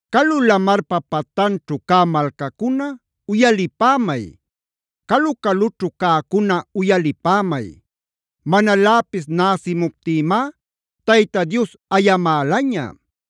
Calu lamarpa patanćhu cä malcacuna uyalipämay; calu-calućhu cäcuna uyalipämay. Manaläpis näsimuptïmá Tayta Dios ayamälaña.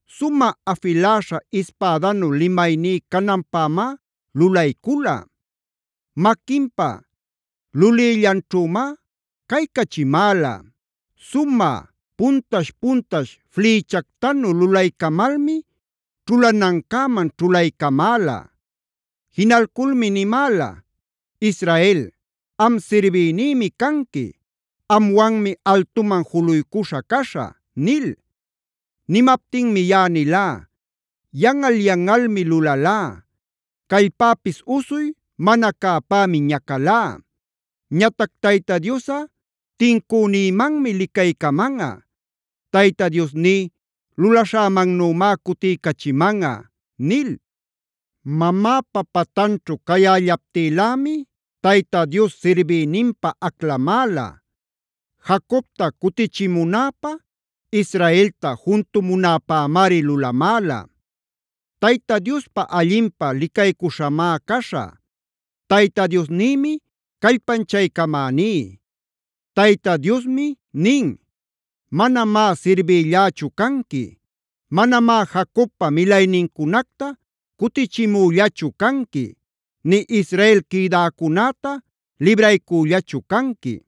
Sumä afiläśha ispädanu limayní cananpämá lulaycula.b Maquinpa lulïllanćhümá caycachimäla. Sumä puntash-puntash flïchactanu lulaycamalmi ćhulanancäman ćhulaycamäla. Jinalculmi nimäla: “Israel, am sirbïnïmi canqui. Amwanmi altuman juluycuśha caśhä” nil. Nimaptinmi yaꞌa nilá: “Yanꞌal yanꞌalmi lulalá; callpäpis usuy mana cäpämi ñacalá. Ñatac Tayta Diosꞌa tincünïmanmi licaycamanꞌa; Tayta Diosní lulaśhämannümá cutiycachimanꞌa” nil. Mamäpa pantanćhu cayällaptïlämi Tayta Dios sirbïninpä aclamäla; Jacobta cutichimunäpä, Israelta juntumunäpämari lulamäla. Tayta Diospa allinpä licaycuśhamá caśhä; Tayta Diosnïmi callpanchaycamäní. Tayta Diosmi nin: “Manamá sirbïllächu canqui; manamá Jacobpa milaynincunacta cutichimüllachu canqui, nï Israel quïdäcunäta libraycüllachu canqui.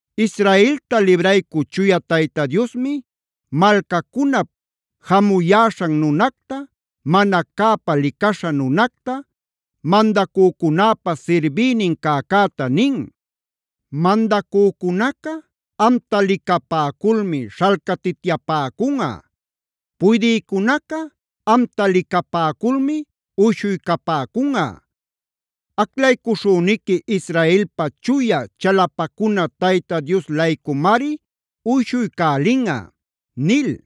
Israelta libraycü Chuya Tayta Diosmi malcacunap jamuyäśhan nunacta, mana cäpa licaśha nunacta, mandacücunäpa sirbïnin cäcäta nin: “Mandacücunaca amta licapäculmi śhalcatityapäcunꞌa. Puydïcunaca amta licapäculmi uyshuycapäcunꞌa. Aclaycuśhüniqui Israelpa Chuya chalapacuna Tayta Dios-laycumari uyshuycälinꞌa” nil.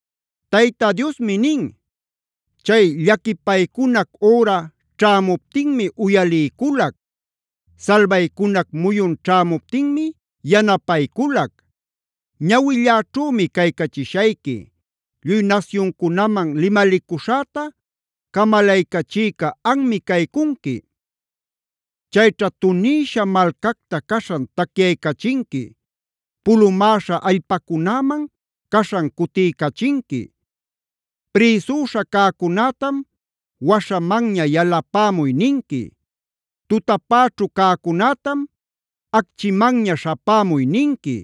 Tayta Diosmi nin: “Chay llaquipaycunac üra ćhämuptinmi uyaliyculac; salbaycunac muyun ćhämuptinmi yanapayculac.e Ñawilläćhümi caycachishayqui; lluy nasyuncunaman limalicuśhäta camalaycachïca anmi caycunqui. Chayćha tunïsha malcacta caśhan tacyaycachinqui; pulumäśha allpacunäman caśhan cutiycachinqui. Prïsüśha cäcunätam: ‘Waśhamanña yalapämuy’ ninqui. Tutapäćhu cäcunätam: ‘Acchimanña śhapämuy’ ninqui.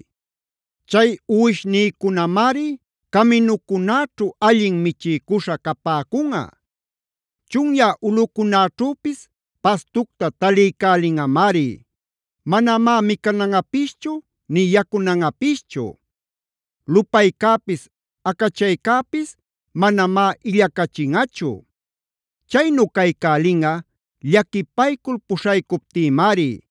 Chay uwishnïcunamari caminucunäćhu allin michiycuśha capäcunꞌa; chunyä ulꞌucunäćhüpis pastucta taliycälinꞌamari. Manamá micananꞌapischu nï yacunanꞌapischu. Lupaycäpis acachaycäpis manamá illacachinꞌachu. Chaynu caycälinꞌa llaquipaycul puśhaycuptïmari;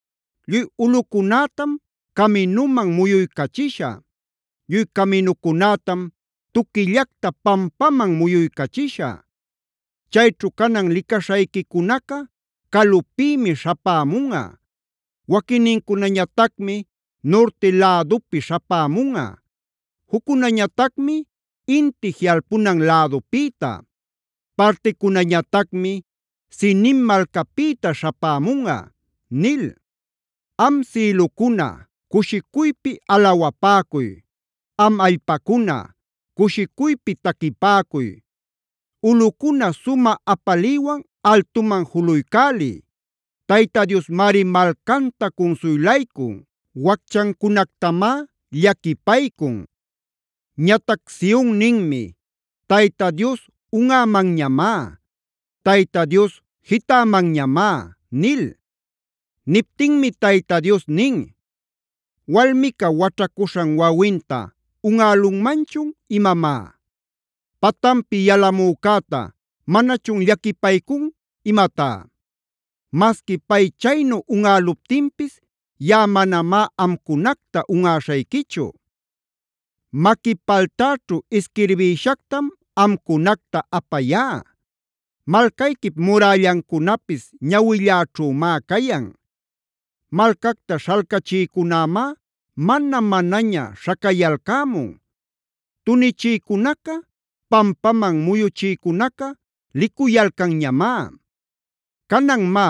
Lluy ulꞌücunätam caminuman muyuycachishä; lluy caminücunätam tuquillacta pampaman muyuycachishä. Cayćhu canan licaśhayquicunaca calupïmi śhapämunꞌa. Waquinnincunañatacmi nurti lädupi śhapämunꞌa; juccunañatacmi inti jiꞌalpunan lädupïta; particunañatacmi Sinim malcapïta śhapämunꞌa” nil. Am sïlucuna, cushicuypi alawapäcuy. Am allpacuna, cushicuypi taquipäcuy. Ulꞌucuna sumä apaliywan altuman juluycäliy. Tayta Diosmari malcanta cunsuylaycun, wacchancunactamá llaquipaycun. Ñatac Sion ninmi: “Tayta Dios unꞌämanñamá; Tayta Dios jitämanñamá” nil. Niptinmi Tayta Dios nin: “¿Walmica waćhacuśhan wawinta unꞌälunmanchun imamá? ¿Patanpi yalamücäta manachun llaquipaycun imatá? Masqui pay chaynu unꞌäluptinpis yaꞌa manamá amcunacta unꞌaśhayquichu. Maqui paltäćhu isquirbïshactam amcunacta apayá; malcayquip murällancunapis ñawilläćhümá cayan. Malcacta śhalcachïcunämá mana-manaña śhacayalcämun; tunichïcunaca pampaman muyuchïcunaca licuyalcanñamá. Canan má,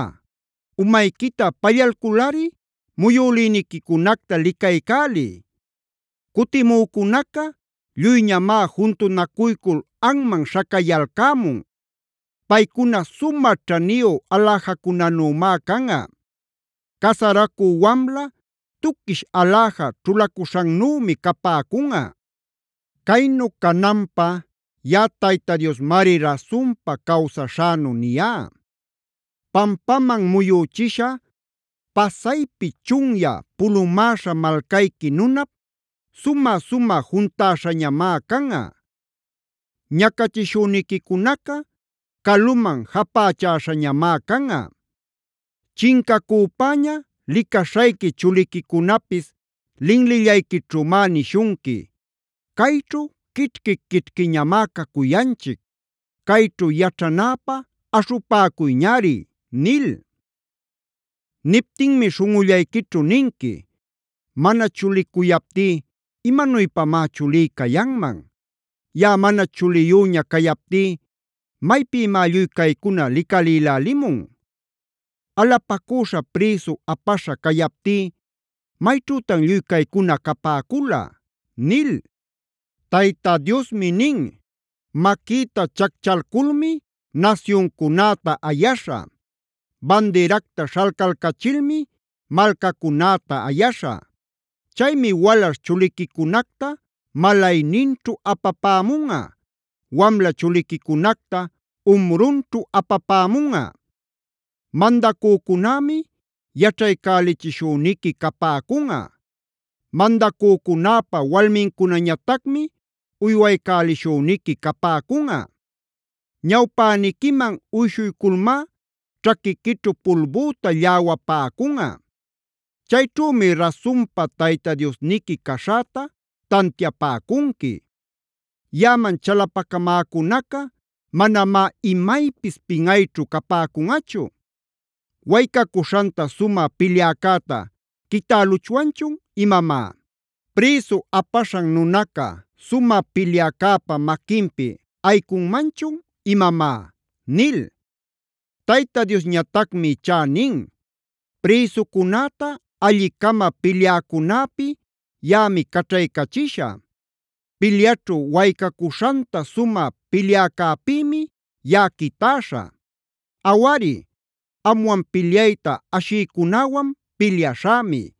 umayquita pallalculꞌari muyülïniquicunacta licaycäliy. Cutimücunaca lluyñamá juntunacuycul anman śhacayalcämun. Paycuna sumä ćhaniyu aläjacunanümá canꞌa; casaracü wamla tuquish aläja ćhulacuśhannümi capäcunꞌa. Caynu cananpä yaꞌa Tayta Diosmari rasunpa cawsaśhänu niyá. “Pampaman muyüchisha, pasaypi chunyä, pulumäśha malcayqui nunap sumä-sumä juntäśhañamá canꞌa. Ñacachishüniquicunaca caluman japächäśhañamá canꞌa. Chincacüpäña licaśhayqui chuliquicunapis linlillayquićhümá nishunqui: ‘Cayćhu quićhqui quićhquiñamá cacuyanchic. Cayćhu yaćhanäpä aśhupäcuyñari’ nil. Niptinmi śhunꞌullayquićhu ninqui: ‘Mana chulicuyaptí, ¿imanuypamá chulí cayanman? Yaꞌa mana chuliyüña cayaptí, ¿maypïmá lluy caycuna licalïlälimun? Alapacüśha prïsu apaśha cayaptí, ¿mayćhütan lluy caycuna capäcula?’” Tayta Diosmi nin: “Maquïta chacchalculmi nasyuncunäta ayaśhä; bandiracta śhalcalcachilmi malcacunäta ayaśhä. Chaymi walaśh chuliquicunacta malayninćhu apapämunꞌa; wamla chuliquicunacta umrunćhu apapämunꞌa. Mandacücunämi yaćhaycälichishüniqui capäcunꞌa; mandacücunäpa walmincunañatacmi uywaycälishüniqui capäcunꞌa. Ñawpäniquiman uyshuyculmá ćhaquiquićhu pulbüta lläwapäcunꞌa. Chayćhümi rasunpa Tayta Diosniqui caśhäta tantiapäcunqui. Yaꞌaman chalapacamäcunaca manamá imaypis pinꞌayćhu capäcunꞌachu. ¿Waycacuśhanta sumä pilyäcäta quitäluchwanchun imamá? ¿Prïsu apaśhan nunaca sumä pilyäcäpa maquinpi ayicunmanchun imamá?” nil. Tayta Diosñatacmi ichá nin: “Prïsucunäta alli-cama pilyäcunäpi yaꞌami caćhaycachishä; pilyaćhu waycacuśhanta sumä pilyäcäpïmi yaꞌa quitäśhä. Awari, amwan pilyayta ashïcunäwan pilyaśhämi;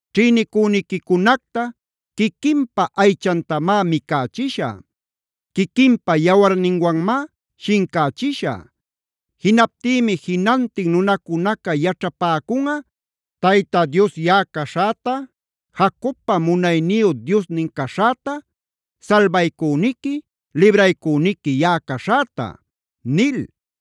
Ćhïnicüniquicunacta quiquinpa aychantamá micächishä; quiquinpa yawarninwanmá shincächishä. Jinaptïmi jinantin nunacunaca yaćhapacunꞌa Tayta Dios yaꞌa caśhäta, Jacobpa munayniyu Diosnin caśhäta, salbaycüniqui, libraycüniqui yaꞌa caśhäta” nil.